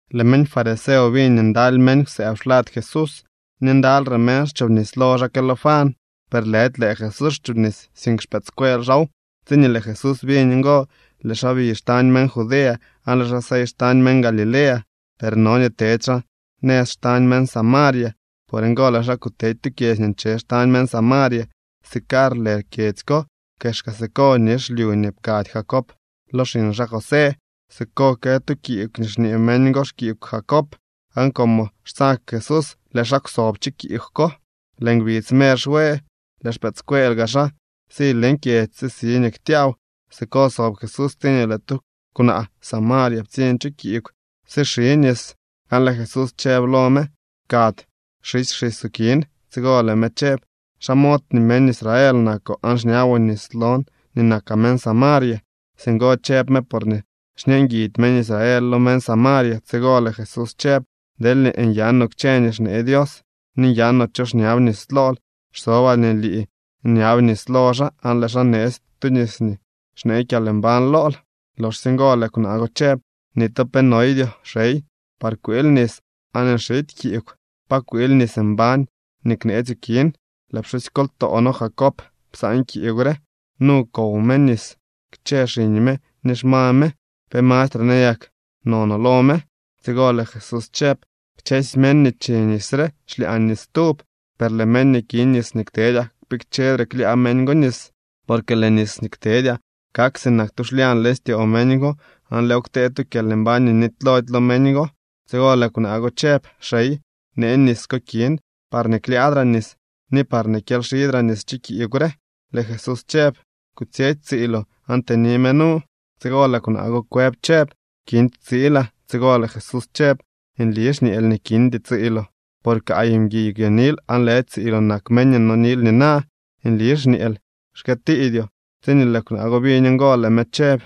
Lëë meñ fariseo biñ nii ndaly meñ kwsëëb xlad Jesús ni ndalyre meñ xchobnis lo xaa que lo Juan. Per lëdy lëë Jesús xchoobnis, sink xpëëdscuel xaaw. Tsiñee lëë Jesús biñ ngo, lëë xaa bi xtañ meñ Judea aan lëë xaa sey xtañ meñ Galilea. Per no nii tedy xaa nëz xtañ meñ Samaria. Por ngo lëë xaa kutedy tu kyedzy nii nche xtañ meñ Samaria. Sicar lë kyedzy ko. Kexka siko nix lyu nii pkady Jacob lo xiñ xaa José. Siko kë tu kiigw nii xñee meñ go xkiigw Jacob, aan como xtsag Jesús, lëë xaa kwsob chu kiigw ko. Lëë ngbidz mer xwe. Lëë xpëëdscuel gaa xaa si leñ kyedzy sisi nii ktyaaw. Siko sob Jesús tsiñee lëë tu kwnaa Samaria ptsiñ chu kiigw sixi nis, aan lëë Jesús chëb lo me: —Pkady xisy xisoo kin. Tsigo lëë me chëb: —¿Xa mod nii meñ Israel nakoo aan xñaboo nis lon nii nakaa meñ Samaria? (Singo chëb me porñee xñeenguidy meñ Israel lo meñ Samaria.) Tsigo lëë Jesús chëb: —Deelñee nyanoo kchë nii xnee Dios, ni nyanoo cho xñab nis lool, xsobaa nii lii nyab nis lo xaa, aan lëë xaa neetsy tu nis nii xnee kyalmbañ lool. Loxsye ngo lëë kwnaa go chëb: —Ni tu pe noydyoo, xey, par kwiil nis aan nxity kiigw. ¿Pa kwiil nis mbañ nii kneetsyoo kin? Lëë pxusykoltoo noo Jacob psaan kiigw re. Nu kow me nis kchë xiñ me ni xma me. ¿Pe mastre nayak nonoo lo me? Tsigo lëë Jesús chëb: —Kchësy meñ nii chi nis re xlyaa nis stub. Per lëë meñ nii ki nis nii ktedyaa, kpikchedre klyaa meñ go nis. Porque lëë nis nii ktedyaa kak sinak tu xlyañ leñ styoo meñ go aan lëëw ktee tu kyalmbañ nii nitylody lo meñ go. Tsigo lëë kwnaa go chëb: —Xey, nee nis ko kin parñee klyaadraa nis, ni parñee kyelyxidraa nis chu kiigw re. Lëë Jesús chëb: —Kutsyetsy tsiiloo aan tëni me nu. Tsigo lëë kwnaa go kwëb chëb: —Kindy tsiilaa. Tsigo lëë Jesús chëb: —Nli xñeel nii kindy tsiiloo, por kaay mguiy kwyonil aan lëdy tsiiloo nak meñ nii nonil nina. Nli xñeel, xkëëtiidyoo. Tsiñee lëë kwnaa go biñ ngo, lëë me chëb: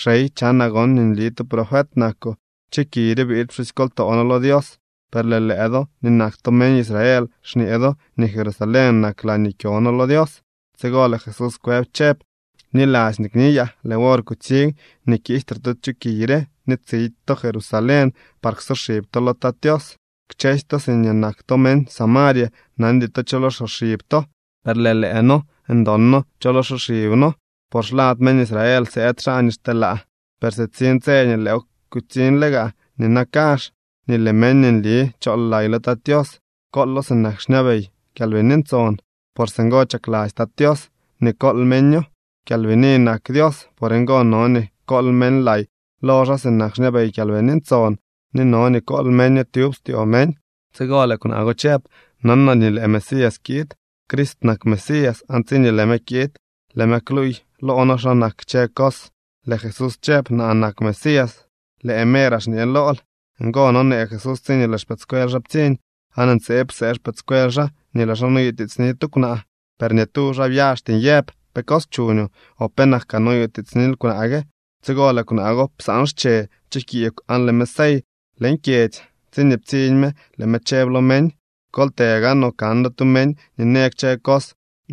—Xey, chanaa gon nii nli tu profet nakoo. Chu kiy re biid pxusykoltoo noo lo Dios, per lëë lëë do nii nak to meñ Israel xñee do nii Jerusalén nak laañee kyo noo lo Dios. Tsigo lëë Jesús kwëb chëb: —Bniladzy nii kniyaa. Lëë wor kutsiñ nii kiijtre to chu kiy re ni tsidy to Jerusalén par ksoxib to lo Tat Tios. Kchësy to siñee nak to meñ Samaria nandy to cho lo xsoxib to, per lëë noo ndon noo cho lo xsoxib noo, por xlad meñ Israel sëëd xaa nii xteelaa. Per sitsiñ tse, ni lëëw kutsiñle gaa nina kazh, nii lëë meñ nii nli chool lay lo Tat Tios koolo sinak xñabey Kyalbini Ntson. Por singo chakladzy Tat Tios nii kool meño. Kyalbini nak Dios. Por ngo no nii kool meñ lay lo xaa sinak xñabey Kyalbini Ntson ni no nii kool meño tyub styoo meñ. Tsigo lëë kwnaa go chëb: —Nanaa nii lëë Mesías kiid (Crist nak Mesías), aan tsiñee lëë me kiid, lëë me kluuy loo noo xa nak kchë cos. Lëë Jesús chëb: —Naa nak Mesías, lëë meeraa xñe lool. Ngo nonee Jesús tsiñee lëë xpëëdscuel xaa ptsiñ, aan ntseeb psee xpëëdscuel xaa nii lëë xaa noyutiitsni tu kwnaa. Per ni tu xaa byaxty nyëb: “Pe cos chuñoo”, o “penak kaa noyutiitsnil kwnaa gue.” Tsigo lëë kwnaa go psaan xche chu kiigw aan lëë me sey leñ kyedzy. Tsiñee ptsiñ me lëë me chëb lo meñ: —Kol të gaanoo kan do tu meñ nii në kchë cos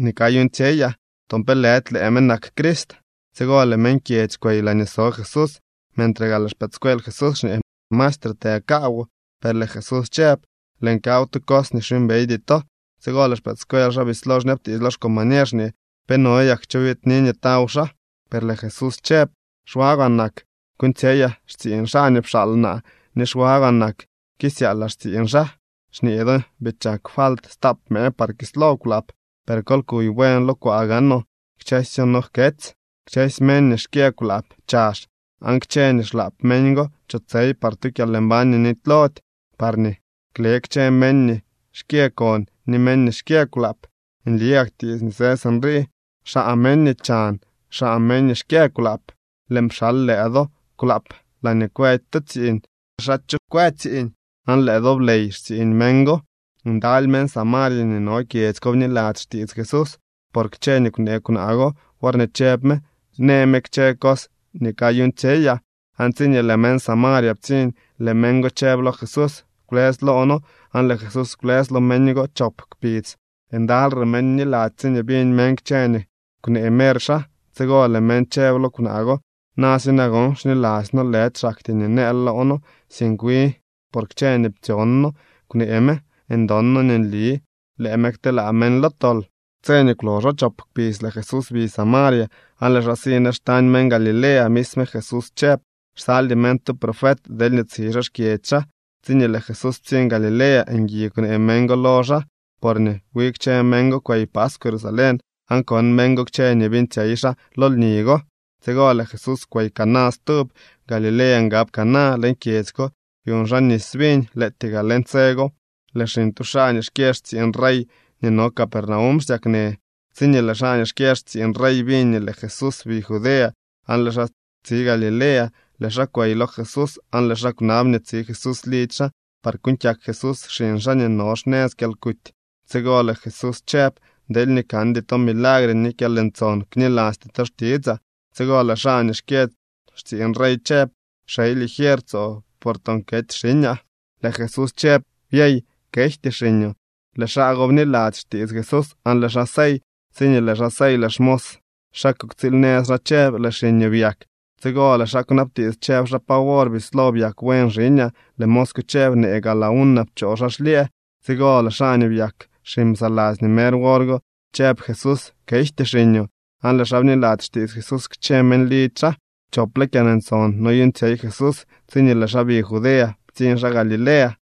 nii kayuuñtsyeyaa. ¿Toon pe lëdy lëë me nak Crist? Tsigo lëë meñ kyedzy kwey laañee so Jesús. Mentre gaa lëë xpëëdscuel Jesús xñee: —Maestre, të kaawoo. Per lëë Jesús chëb: —Lëën kaw tu cos nii xyuumbeydy to. Tsigo lëë xpëëdscuel xaa bislo xñabtiits lo xcombañer xñee: —¿Pe no yak cho biidni nii taw xaa? Per lëë Jesús chëb: —Xwagwaa nak kuuñtsyeyaa xtsiiñ xaa nii pxaal naa, ni xwagwaa nak kisyaalaa xtsiiñ xaa. Xñee do: “Bii chak falt stap mëë par kislo kwlaap”, per kol kuy buen lo kwaa gaanoo, kchësyo no jketsy. Kchësy meñ nii xkyë kwlaap chazh, aan kchë nii xlaap meñ go chotsey par tu kyalmbañ nii nitylody, parñee kle kchë meñ nii xkyë kon ni meñ nii xkyë kwlaap. Nli gak tiits nii së sinrii: “Xaa meñ nii chan, xaa meñ nii xkyë kwlaap.” Lëën pxal lëë do kwlaap laañee kwëdy to tsiiñ. Xaa cho kwë tsiiñ, aan lëë do bley xtsiiñ meñ go. Ndaly meñ Samaria nii no kyedzy ko bniladzy xtiits Jesús por kchë nii kwnee kwnaa go worñee chëb me: “Në me kchë cos nii kayuuñtsyeyaa.” Aan tsiñee lëë meñ Samaria ptsiñ, lëë meñ go chëb lo Jesús: “Kwlës loo noo.” Aan lëë Jesús kwlës lo meñ go chop kpidz. Ndalyre meñ bniladzy tsiñee biñ meñ kchë nii kwnee mer xaa. Tsigo lëë meñ chëb lo kwnaa go: —Na si nagon, xniladzy noo, lëdy xaktyee nii nëël loo noo, sink wi por kchë nii ptsyon noo kwnee me. Ndon noo nii nli lëë me kteelaa meñ lo tol. Tse nii kwloxo chop kpidz, lëë Jesús bi Samaria aan lëë xaa si nëz xtañ meñ Galilea. Misme Jesús chëb: “Xsaldy meñ tu profet deelñee tsi xaa xkyedzy xaa.” Tsiñee lëë Jesús ptsiñ Galilea, ngui kwnee meñ go lo xaa, porñee wi kchë meñ go kwey paskw Jerusalén aan kon meñ go kchë nii beeñtsyey xaa lo lni go. Tsigo lëë Jesús kwey Caná stub. Galilea ngab Caná. Leñ kyedzy ko byuñ xaa nis viñ. Lëëtyee gaa leñ tse go lëë xiñ tu xaa nii xkyë xtsiiñ rey nii no Capernaum xsyaknë. Tsiñee lëë xaa nii xkyë xtsiiñ rey biñ nii lëë Jesús bi Judea aan lëë xaa tsi Galilea, lëë xaa kwey lo Jesús aan lëë xaa kwnab nii tsi Jesús lidzy xaa par kuuñ kyak Jesús xiñ xaa nii no xnëz kyalkuty. Tsigo lëë Jesús chëb: —Deelñee kandy to milagre ni kyalntson, knilasty to xtitsaa. Tsigo lëë xaa nii xkyë xtsiiñ rey chëb: —Xey, ligier tsoo, por toon kety xiñaa. Lëë Jesús chëb: —Byey, kejty xiñoo. Lëë xaa go bniladzy xtiits Jesús aan lëë xaa sey. Tsiñee lëë xaa sey, lëë xmos xaa kuktsiil nëz xaa chëb: —Lëë xiñoo byak. Tsigo lëë xaa kwnabtiits, chëb xaa: —¿Pa wor bislo byak buen xiñaa? Lëë mos chëb: —Neeg a la una pchoo xaa xlyëë. Tsigo lëë xaa nii byak xiñ psaladzy nii mer wor go chëb Jesús: “Kejty xiñoo”, aan lëë xaa bniladzy xtiits Jesús kchë meñ lidzy xaa. Chople kyalntson noyuuñtsyey Jesús tsiñee lëë xaa bi Judea ptsiñ xaa Galilea.